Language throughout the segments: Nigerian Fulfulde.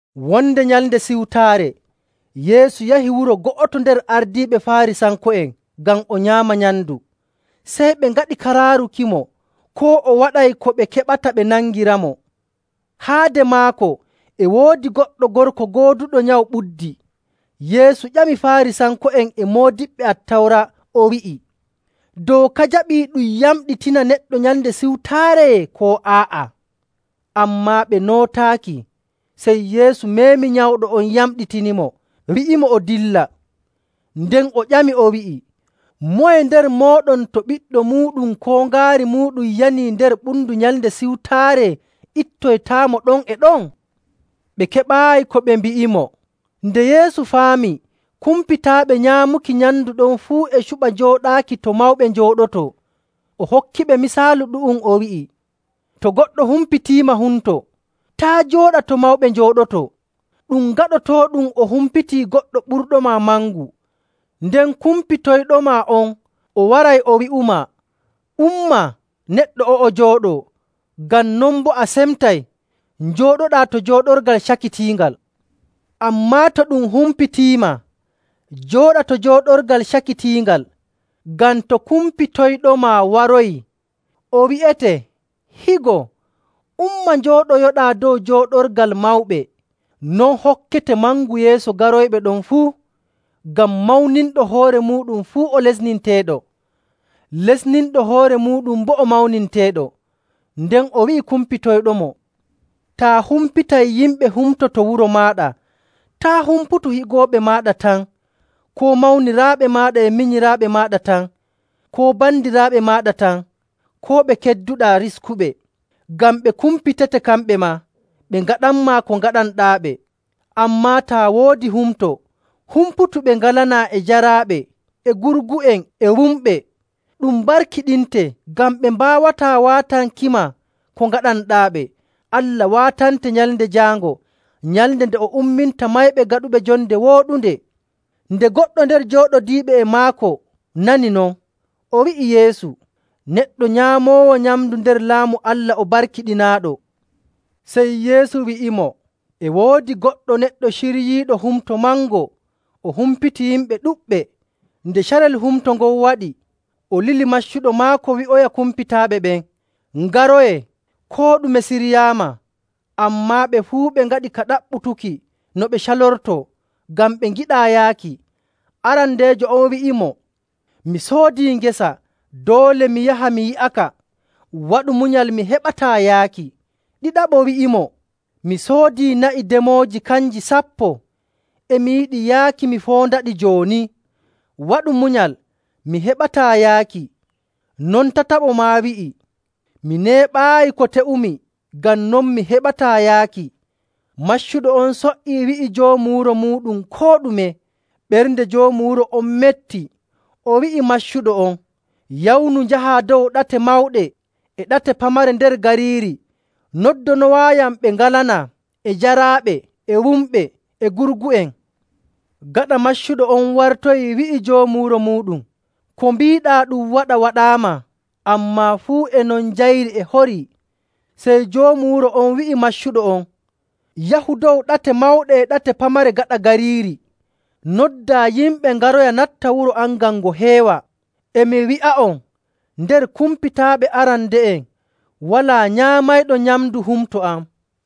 Wonde Nyalnde Siwtaare Yeesu yahi wuro go'oto nder ardiiɓe Faarisanko'en ngam o nyaama nyamndu. Sey ɓe ngaɗi ka raarukimo, koo o waɗay ko ɓe keɓata ɓe nangiramo. Haade maako e woodi goɗɗo gorko gooduɗo nyawu ɓuddi. Yeesu ƴami Faarisanko'en e moodiɓɓe Attawra o wi'i, “Dooka jaɓii ɗum yamɗitina neɗɗo Nyalnde Siwtaare ko aa'a?” Ammaa ɓe nootaaki. Sey Yeesu meemi nyawɗo on yamɗitinimo, wi'imo o dilla. Nden o ƴamiɓe, o wi'i, “Moye nder mooɗon to ɓiɗɗo muuɗum koo ngaari muuɗum yanii nder ɓundu Nyalnde Siwtaare ittoytaamo ɗon e ɗon?”. Ɓe keɓaayi ko ɓe mbi'imo. Nde Yeesu faami kumpitaaɓe nyaamuki nyamndu ɗon fuu e cuɓa jooɗaaki to mawɓe njooɗotoo, o hokkiɓe misaalu ɗu'um, o wi'i, “To goɗɗo humpitiima humto, taa' jooɗa to mawɓe njooɗotoo. Ɗum gaɗotooɗum o humpitii goɗɗo ɓurɗoma mangu. Nden kumpitoyɗoma on o waroyay o wi'umaa, ‘Umma neɗɗo o'o jooɗoo.’ Ngam non boo a semtay, njooɗoɗaa to jooɗorgal cakitiingal. Ammaa to ɗum humpitiima, jooɗa to jooɗorgal cakitiingal, ngam to kumpitoyɗoma waroyi, o wi'ete, ‘Higo, umma, njooɗoyoɗaa dow jooɗorgal mawɓe.’ Non hokkete mangu yeeso garoyɓe ɗon fuu.. Ngam mawninɗo hoore muuɗum fuu o lesneteeɗo, lesninɗo hoore muuɗum boo o mawninteeɗo.”. Nden o wi'i kumpitoyɗomo, “Taa humpitay yimɓe humto to wuro maaɗa, taa' humputu higooɓe maaɗa tan, koo mawniraaɓe e minyiraaɓe maaɗa tan, koo bandiraaɓe maaɗa tan, koo ɓe kedduɗaa riskuɓe. Ngam ɓe kumpitete kamɓe maa, ɓe ngaatanmaa ko ngaɗanɗaaɓe. Ammaa taa woodi humto, humputu ɓe ngalanaa, e jaraaɓe, e gurgu'en, e wumɓe. Ɗum barkiɗinte, ngam ɓe mbaawataa waatankima ko ngaɗanɗaaɓe. Allah waatante Nyalnde Jaango, nyalnde nde o umminta mayɓe gaɗuɓe jonde wooɗunde.” Nde goɗɗo nder jooɗodiiɓe e maako nani non, o wi'i Yeesu, “Neɗɗo nyaamoowo nyamndu nder Laamu Allah o barkiɗinaaɗo!” Sey Yeesu wi'imo, “E woodi goɗɗo neɗɗo ciryiiɗo humto mango o humpiti yimɓe ɗuɗɓe. Nde carel humto ngon waɗi, o lili maccuɗo maako wi'oya kumpitaaɓe ɓen, ‘Ngaroyee, koo ɗume siryaama!’ Ammaa ɓe fuu ɓe ngaɗi ka ɗaɓɓutuki no ɓe calortoo ngam ɓe ngiɗaa yaaki. Arandeejo on wi'imo, ‘Mi soodii ngesa, doole mi yaha mi yi'aka. Waɗu munyal, mi heɓataa yaaki.’ Ɗiɗaɓo wi'imo, ‘Mi soodii na'i demooji kanji sappo, e mi yiɗi yaaki mi foondaɗi jooni. Waɗu munyal mi heɓataa yaaki.’ Non tataɓo maa wi'i, ‘Mi neeɓaayi ko te'umi, ngam non mi heɓataa yaaki.’ Maccuɗo on so''ii wi'i joomu wuro muuɗum koo ɗume. Ɓernde joomu wuro on metti, o wi'i maccuɗo on, ‘Yawnu njahaa dow ɗate mawɗe e ɗate pamare nder gariiri, noddanowaayam ɓe ngalanaa, e jaraaɓe, e wumɓe, e gurgu'en.’ Gaɗa maccuɗo on wartoyii wi'i joomu wuro muuɗum, ‘Ko mbiiɗaa ɗum waɗa waɗaama, ammaa fuu e non njayri e horii.’ Sey joomu wuro on wi'i maccuɗo on, ‘Yahu dow ɗate mawɗe e ɗate pamare gaɗa gariiri, noddaa yimɓe ngaroya natta wuro am ngam ngo heewa. E mi wi'a'on, nder kumpitaaɓe arande'en walaa nyaamayɗo nyamndu humto am.’”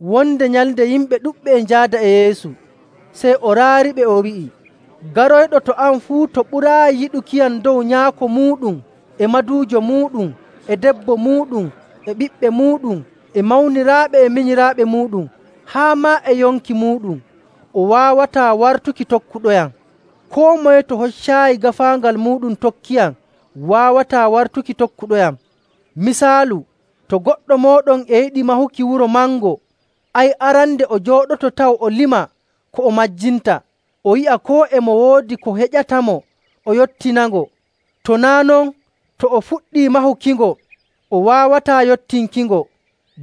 Wonde nyalnde yimɓe ɗuɗɓe e njaada e Yeesu. Sey o raariɓe o wi'i, “Garoyɗo to am fuu to ɓuraayi yiɗukiyam dow nyaako muuɗum e maduujo muuɗum e debbo muuɗum e ɓiɓɓe muuɗum e mawniraaɓe e minyiraaɓe muuɗum ‑ haa maa e yonki muuɗum, o waawataa wartuki tokkuɗoyam.. Koo moye to hoccaayi gaafaangal muuɗum tokkiyam waawataa wartuki tokkuɗoyam.. Misaalu, to goɗɗo mooɗon e yiɗi mahuki wuro mango, ay arande o jooɗoto taw o lima ko o majjinta, o yi'a koo e mo woodi ko heƴatamo o yottinango. To naa' non, to o fuɗɗii mahukingo o waawataa yottinkingo,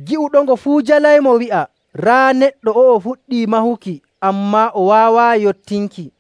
gi'uɗongo fuu jalaymo wi'a, ‘Raa neɗɗo o'o fuɗɗii mahuki, ammaa o waawaayi yottinki.’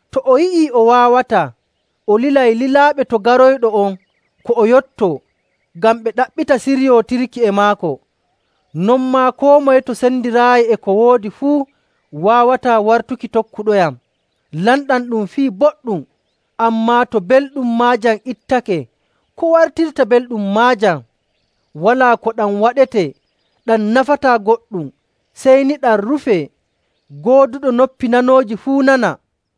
To o yi'ii o waawataa, o lilay lilaaɓe to garayɗo on ko o yotto, ngam ɓe ɗaɓɓita siryootirki e maako. Non maa, koo moye to sendiraayi e ko woodi fuu waawataa wartuki tokkuɗoyam. “Lamɗam ɗum fii boɗɗum, ammaa to belɗum maajam ittake, ko wartirta belɗum maajam? Walaa ko ɗam waɗetee. Ɗam nafataa goɗɗum, sey ni ɗam rufee. Gooduɗo noppi nanooji fuu nana!”